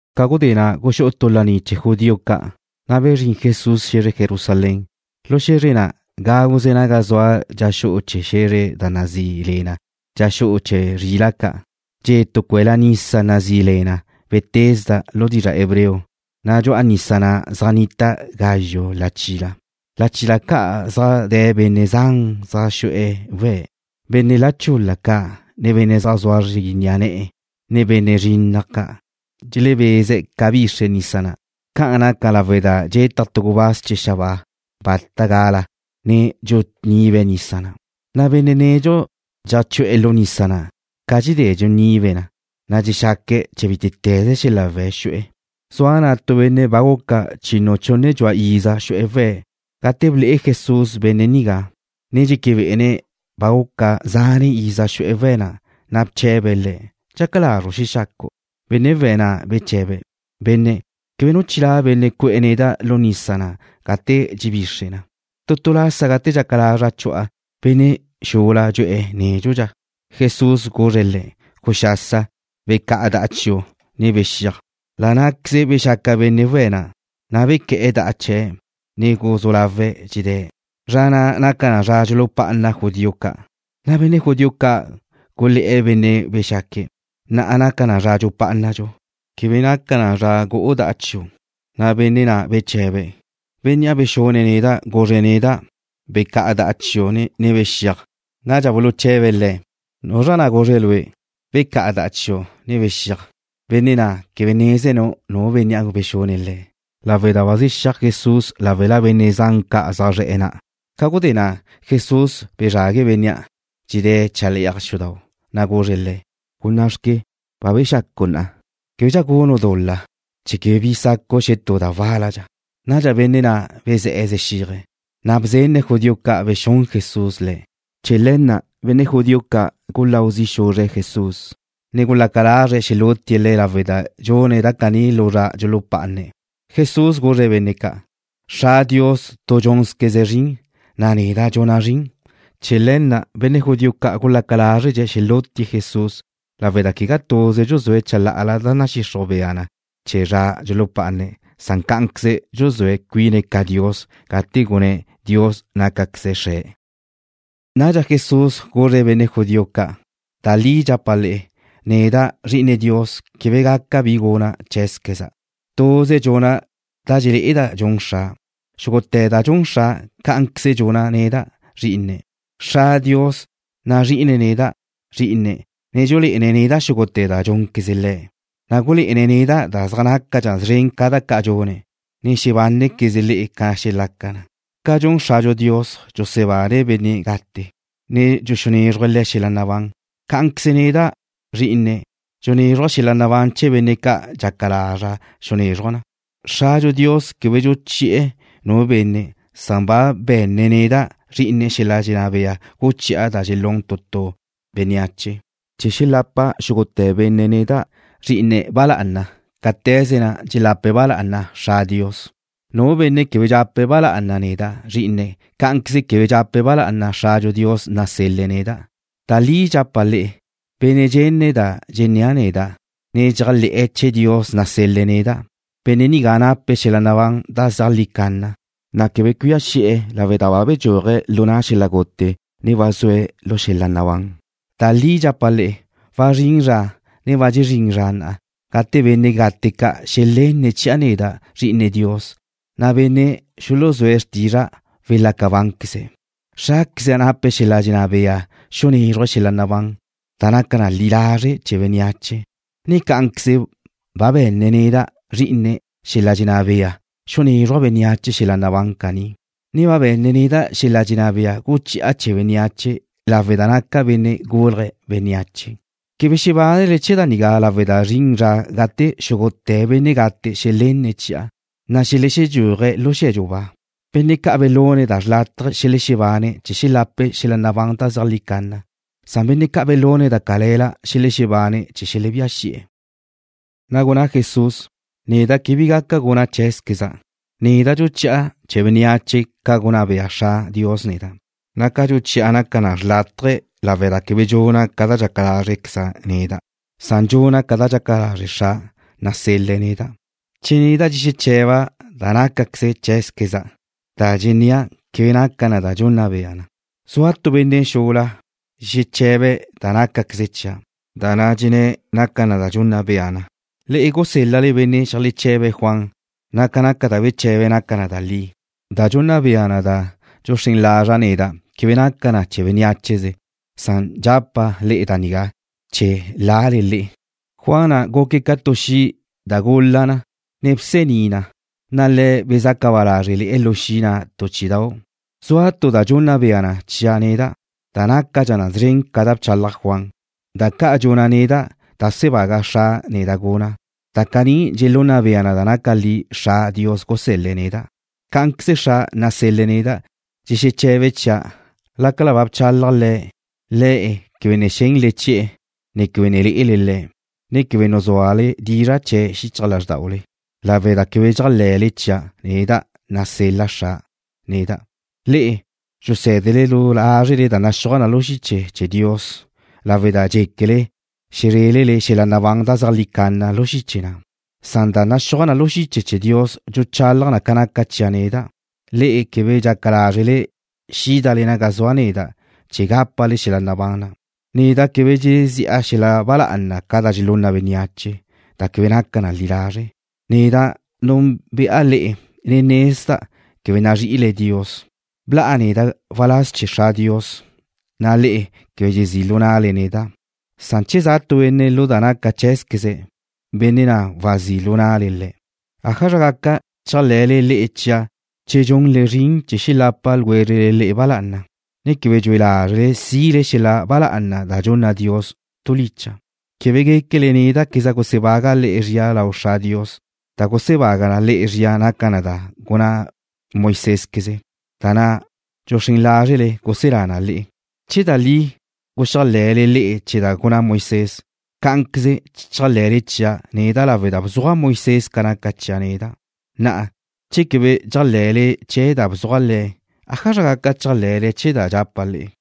Ca gudé na' guxú'u tu laní chee̱ judío ca', na' bezrín Jesús xe̱zre Jerusalén. Lu xe̱zre na', gáguze naga zua dxa xu'u chee̱ xe̱zre da nazí le na Dxa Xu'u Chee̱ Zrila' Ca', dxe' tu cue'la nisa nazí le na Betesda lu dizra' hebreo, na' dxu'a nisa na' zaj nnita gazxu' lachila. Lachila ca' zaj de̱ benne' zan zaj xu'e̱ we̱', benne' la chul-la ca', ne benne' zaj zua zri ni'a ne̱'e̱, ne benne' zrinnaj ca'. Dxelebeze̱' ca bixre nisa na'. Ca'an naca lawe' da dxetaj tu gubáz chee̱ xabáa bata gala, ne dxunibe̱' nisa na', na' benne' nedxu dxeajchu'e̱ lu nisa na' ca dxedé dxunibe̱' na, dxexaque̱' chee̱ bítete̱ze xel-la' we̱' xu'e̱. Zua tu benne' na' ba guca chinu chunne dxua iza xu'e̱ we̱'. Gate ble'e Jesús benne' nigá, ne dxeque bé'ene̱' ba guca zane' iza xu'e̱ we̱' na', na' bche̱be̱' le̱': ―¿Dxaca lazru' xexacu'? Benne' we̱' na' beche̱be̱': ―Benne', quebe nu chilá' benne' cu'e̱ neda' lu nisa na' ca dxedé dxebixre na. Tu tu lasa gate dxaca lazra' chu'a, benne' xula dxu'e̱ nédxudxa. Jesús guzre̱' le̱': ―¡Guxasa! Becá'a da'a chiu', ne bexíaj. La' ná'queze bexaca benne' we̱' na', na' bequé̱'e̱ da'a chee̱', ne guzú lawe̱' dxedé̱'. Zra na' naca zra dxulupá'ana judío ca', na' benne' judío ca' gulé̱'e̱ bénnea' bexaque̱': ―Na'a naca na zra dxupá'anadxu. Quebe naca na gu'u da'a chiu'. Na' benne' na' beche̱be̱': ―Bénnea' bexune̱' neda' guzre̱' neda': “Becá'a da'a chiu', ne bexíaj.” Nadxa buluche̱be̱' le̱': ―¿Nuzra na' guzre̱' lue': Becá'a da'a chiu', ne bexiaj? Benne' na' quebe nézene̱' nu bénnea' bexune̱' le̱' lawe' da ba zexíaj Jesús láwela benne' zan ca' zaj zre̱'e̱ na'. Ca gudé na' Jesús bezrague̱' bénnea', dxedé̱' chale'aj xudau', na' guzre̱' le̱': ―¡Gunná'xque! Ba bexacu' na'a. Québedxa gunu' dul-la, chee̱ quebe bi sacu' xetú da wál-ladxa. Nadxa benne' na' bezé̱'e̱ zexíaje̱', na' bzenne̱' judío ca' bexún Jesús le̱'. Chee̱ le̱ na' benne' judío ca' guláu zi' xuzre̱' Jesús, ne gulaca lazre̱' xelútie̱' Le̱' lawe' da dxune̱' da caní lu zra dxulupá'ane̱'. Jesús guzre̱' benne' ca': ―Dios, Xra', tu dxúnzqueze̱' zrin, na' neda' dxuna' zrin. Chee̱ le̱ na' benne' judío ca' gulaca lázredxe̱' xelútie̱' Jesús lawe' da quegá tuze dxuzúe̱' chalá'ala da nadxixruj bea na chee̱ zra dxulupá'ane̱', na' cá'anqueze dxun cuine̱' ca Dios gate gunné̱' Dios nácaqueze̱' Xre̱'. Nadxa Jesús guzre̱' benne' judío ca': ―Da li dxapa' le'e, neda', Zri'ine Dios, quebe gaca bi guna' cheé̱zqueza'. Tuze dxuna' da dxelé'eda' dxun Xra'. Xúgute̱ da dxun Xra', cá'anqueze dxuna' neda', Zrí'ine̱'. Dios, Xra', nazrí'ine̱' neda', Zrí'ine̱', ne dxulé'ene̱' neda' xúgute̱ da dxúnqueze̱' Le̱', na' gulé'ene̱' neda' da zaj nácadxa szren ca da ca' dxuna', na' xebánequezle le'e ca xelaca na. Ca dxun Xradxu Dios, dxusebane̱' benne' gate, ne dxuxunézruje̱' xel-la' nabán chee̱', cá'anqueze neda', Zrí'ine̱', dxuxunézruja' xel-la' nabán chee̱ benne' ca' dxaca lazra' xunézruja' na. Xradxu Dios quebe dxuchi'e̱ nu benne', san ba be̱nne̱' neda', Zrí'ine̱', xel-la' dxenná bea guchi'a da dxelún tu tu bénneache, chee̱ xelapa xúgute̱ benne' neda', Zrí'ine̱', ba lá'ana, cáte̱ze na' dxelape̱' ba lá'ana Dios, Xra'. Nu benne' quebe dxape̱' ba lá'ana neda', Zrí'ine̱', cá'anqueze quebe dxape̱' ba lá'ana Xradxu Dios nasel-le̱' neda'. ’Da li dxapa' le'e, benne' dxenne̱' da dxennéa' neda', ne dxéajle̱'e̱ chee̱ Dios nasel-le̱' neda', benne' nigá nape̱' xel-la' nabán da zeajlí canna, na' quebe cuía xi'e̱ lawe' da ba bedxúaje̱' lu na' xel-la' gute, ne ba zue̱' lu xel-la' nabán. Da li dxapa' le'e, wazrín zra, ne ba dxezrín zra na' gate benne' gate ca' xelenne̱' chi'a neda', Zri'ine Dios, na' benne' xuluzúa xrtizra' welaca bánqueze̱'. Xráqueza' nape̱' xel-la' dxenná bea xunézruje̱' xel-la' nabán da naca na li lazre' chee̱ bénneache, ne cá'anqueze ba be̱nne̱' neda', Zrí'ine̱', xel-la' dxenná bea xunézruja' bénneache xel-la' nabán caní, ne ba be̱nne̱' neda' xel-la' dxenná bea guchi'a chee̱ bénneache lawe' da naca' Benne' Gulje̱' Bénneache. Quebe xebánele chee̱ da nigá lawe' da zrin zra gate xúgute̱ benne' gate xelenne̱' chi'a xelexedxúaje̱' lu xe̱dxu ba. Benne' ca' belune̱' da xrlátaje xelexebane̱' chee̱ xelape̱' xel-la' nabán da zeajlí canna. Benne' ca' belune̱' da cale̱la xelexebane̱' chee̱ xelebía xi'e̱. Na' gunná Jesús: ―Neda' quebe bi gaca guna' cheé̱zqueza'. Neda' dxuchi'a chee̱ bénneache ca gunná bea Dios, Xra', neda', na' ca dxuchi'a naca na xrlátaje lawe' da quebe dxuna' ca da dxaca lázrequeza' neda'. Dxuna' ca da dxaca lazre' Xra', nasel-le̱' neda'. Che neda' dxexeche̱ba' da nácaze cheé̱queza', da dxennéa' quebe naca na da dxunna bea na. Zua tu benne' xula dxexeche̱be̱' da nácaqueze chia', na' da dxenné̱' naca na da dxunna bea na. Le'e gusél-lale benne' xeajleche̱be̱' Juan, na' ca da beche̱be̱' naca na da li. Da dxunna bea na da dxuxrén lazra' neda' quebe naca na chee̱ bénneacheze. Dxapa' le'e da nigá chee̱ lale le'e. Juan na' guque̱' ca tu xi' da gula na, ne bsení na, na' le'e bezaca ba lázrele lu xi' na' tu chí'idau'. Zua tu da dxunna bea na chia' neda', da nácadxa szren ca da bchalaj Juan. Da ca' dxuna' neda', da bsebaga Xra' neda' dxuna'. Da caní dxelunna bea na da li Dios, Xra', gusél-le̱' neda'. Cá'anqueze Xra' nasel-le̱' neda' dxexeche̱be̱' chia'. Lácala ba bchalaj Le̱', le'e quebe ne xénele chi'e̱, ne quebe ne lé'ele Le̱', ne quebe nuzúale dizra' chee̱' xichaj lázrdaule lawe' da quebe dxéajle̱le chia' neda', nasel-la Xra' neda'. Le'e dxusé̱dele du lázrele da naxúaj na lu xiche chee̱ Dios lawe' da dxéquele xezrélele xel-la' nabán da zeajlí canna lu xiche na', na' da naxúaj na lu xiche chee̱ Dios dxuchalaj na ca naca chia' neda'. Le'e quebe dxaca lázrele xídale naga zua' neda' chee̱ gápale xel-la' nabán na'. ’Neda' quebe dxezi'a xel-la' ba lá'ana ca da dxelunna bénneache, da quebe naca na li lazre'. Neda' núnbe'a le'e, ne nezda' quebe nazrí'ile Dios. Bla'a neda' waláz chee̱ Dios, Xra', na' le'e quebe dxezí' lu na'le neda'. Che za' tu benne' lu da naca cheé̱zqueze̱', benne' na' wazí' lu na'le. ¿Ájazra gaca chéajle̱le le'e chia' che dxunle zrin chee̱ xelapa ljwézrele le'e ba lá'ana, ne quebe dxue lázrele sile xel-la' ba lá'ana da dxunna Dios tu licha'? Quebe guéquele néda'queza' gusebaga' le'e zria lau Dios, Xra'. Da gusebaga le'e zria naca na da ba gunná Moisésqueze, da na' dxuxrén lázrele guselá na le'e. Che da li guxéajle̱le le'e chee̱ da gunná Moisés, cá'anqueze chéajle̱le chia' neda' lawe' da bzuaj Moisés ca naca chia' neda'. Na'a, che quebe dxéajle̱le chee̱ da bzuaj le̱', ¿ájazra gaca chéajle̱le chee̱ da dxapa' le'e?